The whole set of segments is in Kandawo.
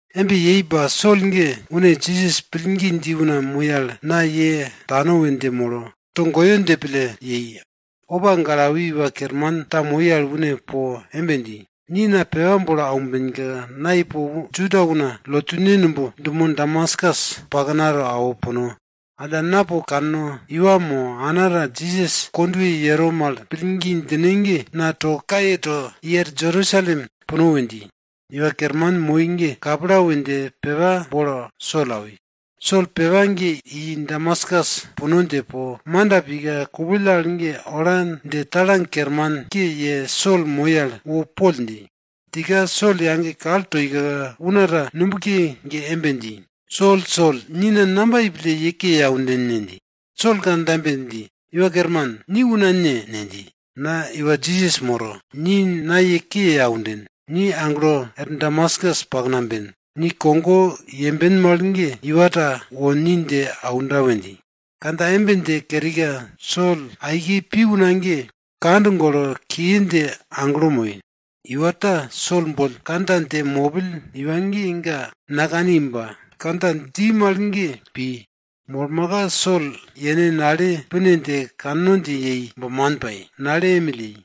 Embe yei ba Sol ge, une Jisas pillgi dji una moi al, na ye tano we dje molo, togoyo dje pille yei. Opa gale awi iwa kerman ta moi al une po embe dji, ni na pepa bolo aumbenka, na ipo Juda una lotune numb dumo Damaskus paknato awo puno. Alla, na po kanno, iwa mo ana ta Jisas kondwe yero mal pillgi djine ge na to kaye to, i er Jerusalem puno we dji. Iwa kerman moi ge kapla we dje pepa bolo Sol awi. Sol pepa ge i Damaskus puno dje po, manda pika, kupill al ge ola dje au kermanke dje Sol moi al wo poll dji. Djika, Sol yage kal toika, una ta nubke ge embe dji, Sol, Sol, ni na namba yei pille ye ke ye aunden ne? dji. Sol kandja embe dji, Iwa Kerman, ni una ne? ne dji. Na iwa Jisas moro. Ni na ye ke ye aunden. Ni aglo er Damaskus pakna ben. Ni kogo yemben mal ge iwa ta wo ni dje aunda we dji. Kandja embe dje kerika, Sol aike pi una ge kand golo kiye dje aglo moi. Iwa ta Sol boll kandja dje mopill iwa ge ga nakani ba kandja dji mal ge ga pi. Molmaka Sol yene nale pine dje kanno dje yei ba man pai, nale emill yei.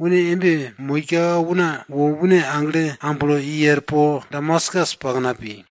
Une embe moika una wo une agle amblo i er po Damaskus pakna pi.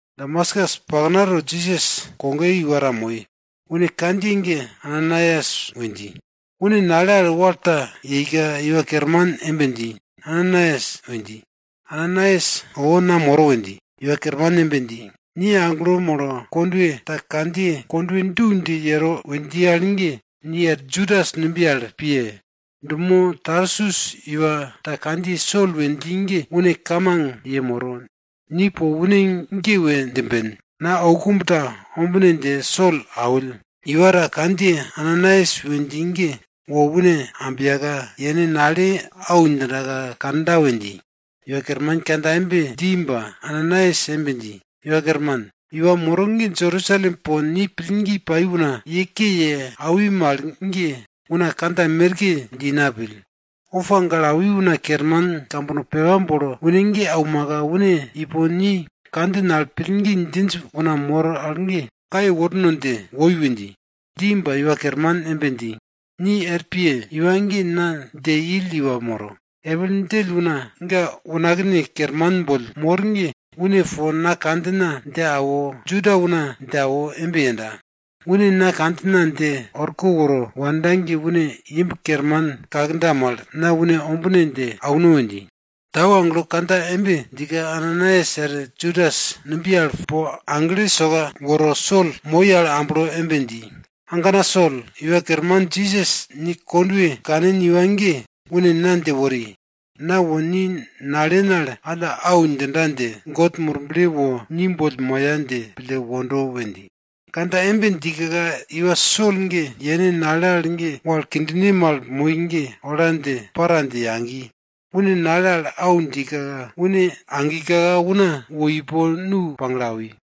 Damaskus paknato Jisas kogoye iwa ta moi. Une kandjiye ge Ananaias we dji. Une nale al wal ta yeika Iwa Kerman embe dji, Ananaias! we dji. Ananaias owo, na moro we dji. Iwa Kerman embe dji, ni aglo molo kondwe ta kandjiye Kondwe du dje yero we dji al ge, ni er Judas numbiye al piye! Dumo Tarsus iwa ta kandjiye Sol we dji ge une kamang yemoro, ni po une ge we djimben. Na oukumb ta ombine dje Sol awill, iwa ta kandjiye Ananaias we dji ge wo une ambiyaka, yene nale au djindaka kanda we dji. Iwa Kerman kandja embe dji ba, Ananaias embe dji, Iwa Kerman, iwa moro ge Jerusalem po ni pillgi pai una ye ke ye awi mal ge, una kandja merke dji na pill. Opa gale awi una kerman kambono pepa bolo une ge aumaka une ipo ni kandjin al pillgi djinj una mor al ge kaye worno dje woi we dji. Dji ba, Iwa Kerman embe dji, ni er piye! Iwa ge na dje ill iwa moro. Epil djell una ga unakne kerman boll mor ge une po na kandjina dje awo, Juda una dje awo embe yenda. Une na kandjina dje orko woro wanda ge une imb kerman kakda mal, na une ombine dje auno we dji. Tau agelo kandja embe djika, Ananaias er Judas numbiye al po agle soka woro Sol moi al amblo embe dji, agana Sol, Iwa Kerman Jisas ni kondwe kanin iwa ge, une na dje wori, na wo ni nalen al alla au djinda dje, God Murble wo ni boll moya dje pille wondo we dji. Kandja embe djika iwa Sol ge yene nale al ge wal kindine mal moi ge ola dje para dje yagi. Une nale al au djika, une agika una wo ipo nu pagle awi.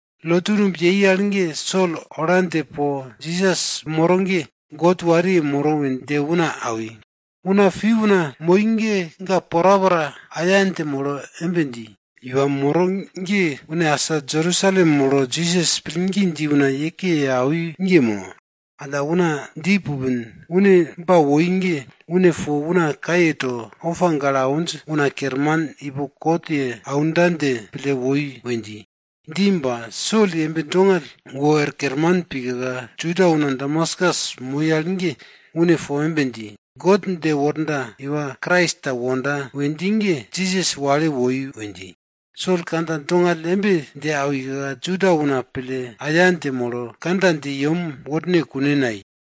Lotu numb yei al ge Sol ola dje po Jisas moro ge God wariye moro we dje una awi. Una pi una moi ge, ga porapora aya dje molo embe dji, iwa moro ge une asa Jerusalem molo Jisas pillgi dji una ye ke ye awi iwa ge mo? Alla, una dji pupin, une ba woi ge, une po una kaye to, opa gale awinj una kerman boll kot ye aumbon dje pille woi we dji. Dji ba, Sol yembe dongall wor kerman pika, Juda una Damaskus moi al ge une po embe dji, God dje worda iwa Krais ta wonda we dji ge, Jisas wale woi we dji. Sol kandja dongall embe dje awika, Juda una pille aya dje molo, kandja dje yem worne kune nayei.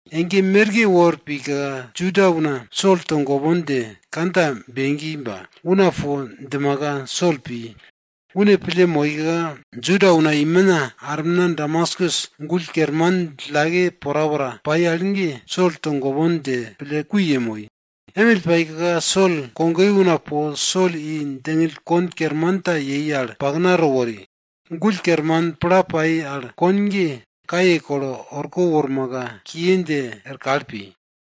Ege merke wor pika Juda una Sol togopon dje kandja begi ba, una po djimaka, Sol pi. Une pille moika, Juda una imina armina Damaskus gull kerman djillake porapora yei al ge, Sol togopon dje pille kui yemoi. Emill paika Sol kogoye una po Sol i kon basket kerman ta yei al paknato wori. Gull kerman pla pai al kon ge kaye kolo orko wormaka kiye dje er kal pi.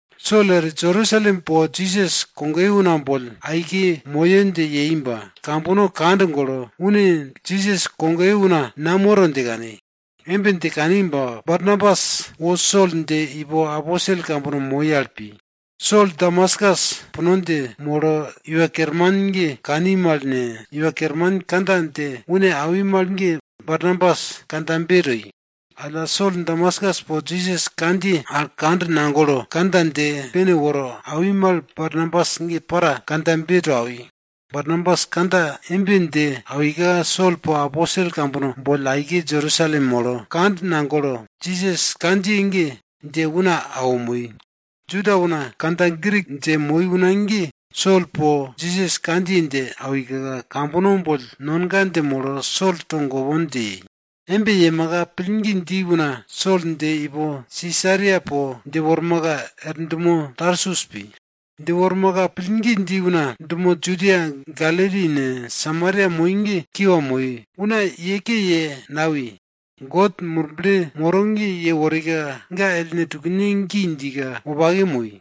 Sol er Jerusalem po Jisas kogoye una boll aike moyo dje yei ba, kambono kand golo, une Jisas kogoye una namoro dje kani. Embe dje kani ba Barnabas wo Sol dje ipo aposel kambono moi al pi. Sol Damaskus puno dje molo Iwa Kerman ge kani mal ne, Iwa Kerman kandja dje une awi mal ge Barnabas kandjabe toi. Alla Sol Damaskus po Jisas kandjiye al kand nagolo, kandja dje pene woro awi mal, Barnabas ge para kandjabe to awi. Barnabas kandja embe dje awika, Sol po aposel kambono boll aike Jerusalem molo, kand nagolo, Jisas kandjiye ge dje una awo moi. Juda una kandja Grik dje moi una ge Sol po Jisas kandjiye dje awika, kambono boll nonga dje molo Sol togopon dje yei. Embe yemaka pillgi dji una Sol dje ipo Sisaria po dje wormaka er dumo Tarsus pi. Dje wormaka, pillgi dji una dumo Judia, Galili ne, Samaria moi ge una kiwa moi, una ye ke ye nawi. God Murble moro ge yeworika ga ellne tukne gi djika, wopake moi.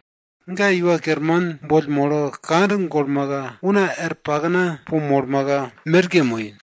Ga Iwa Kerman boll molo kand golmaka, una er pakna po molmaka merke moi.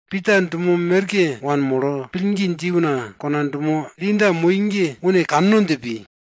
Pita dumo merke wanmolo, pillgi dji una kona dumo Linda moi ge une kanno dje pi.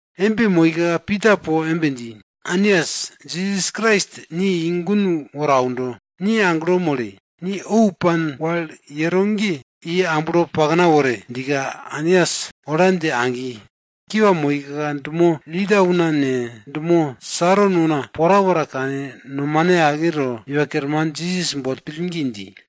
Embe moika Pita po embe dji, Ainias, Jisas Krais ni i gun woro aundo. Ni aglo mole! Ni ou pan wal yero ge, i amblo pakna wore! djika Ainias ola dje agi. Kiwa moika, dumo Linda una ne, dumo Saron una porapora kane, nomane ake to, Iwa Kerman Jisas boll pillgi dji.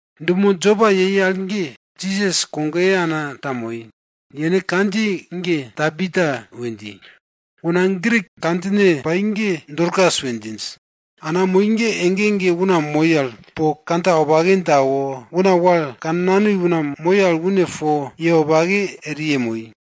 Dumo Jopa ge Jisas kogoye ana ta moi. Yene kandjiye ge Tabita we dji. Una Grik kandjine pai ge Dorkas we djinj. Ana moi ge ege ege una moi al po kandja wopake dje awo, una wal kannanoi una moi al une po ye wopake eri yemoi.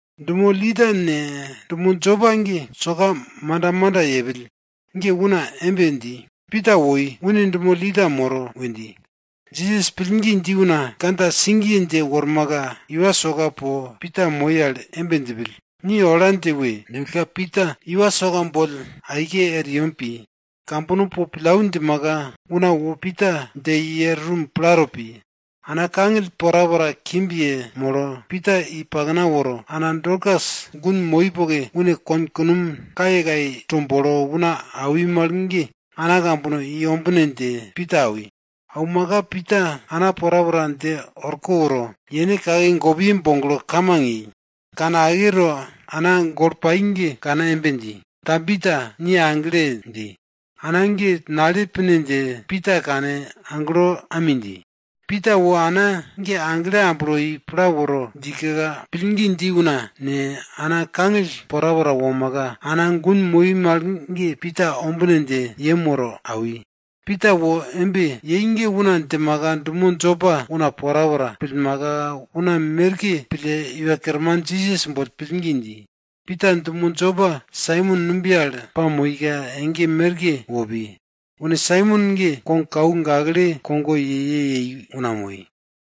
Dumo Linda ne, dumo Jopa ge soka manda manda yepill ge una embe dji, Pita woi, une dumo Linda moro we dji. Jisas pillgi dji una kandja sigiye dje wormaka iwa soka po, Pita moi al embe djipill, ni ola dje we! djipillka, Pita iwa soka boll aike er yem pi. Kambono po pillau djimaka, una wo Pita dje i er rum plato pi. Ana kangill porapora kimb yemolo, Pita i pakna woro, ana Dorkas gun moi poke une kon konom kayekaye to bolo una awi mal ge ana kambono i ombine dje Pita awi. Aumaka Pita ana porapora dje orko woro, yene kake gopiye boglo kamang yei. Kane ake to ana golo pai al ge kane embe dji, Tabita, ni agle! dji. Ana ge nale pine dje Pita kane aglo ami dji. Pita wo ana ge agle amblo i pla woro djika, pillgi dji una ne, ana kangill porapora womaka, ana gun moi mal ge Pita ombine dje yem woro awi. Pita wo embe yei ge una djimaka dumo Jopa una porapora pillmaka, una merke pille Iwa Kerman Jisas boll pillgi dji. Pita dumo Jopa Saimon numbiye al pamoika ege merke wo pi. Une Saimon ge kogkau gakle kogo ye ye yei una moi.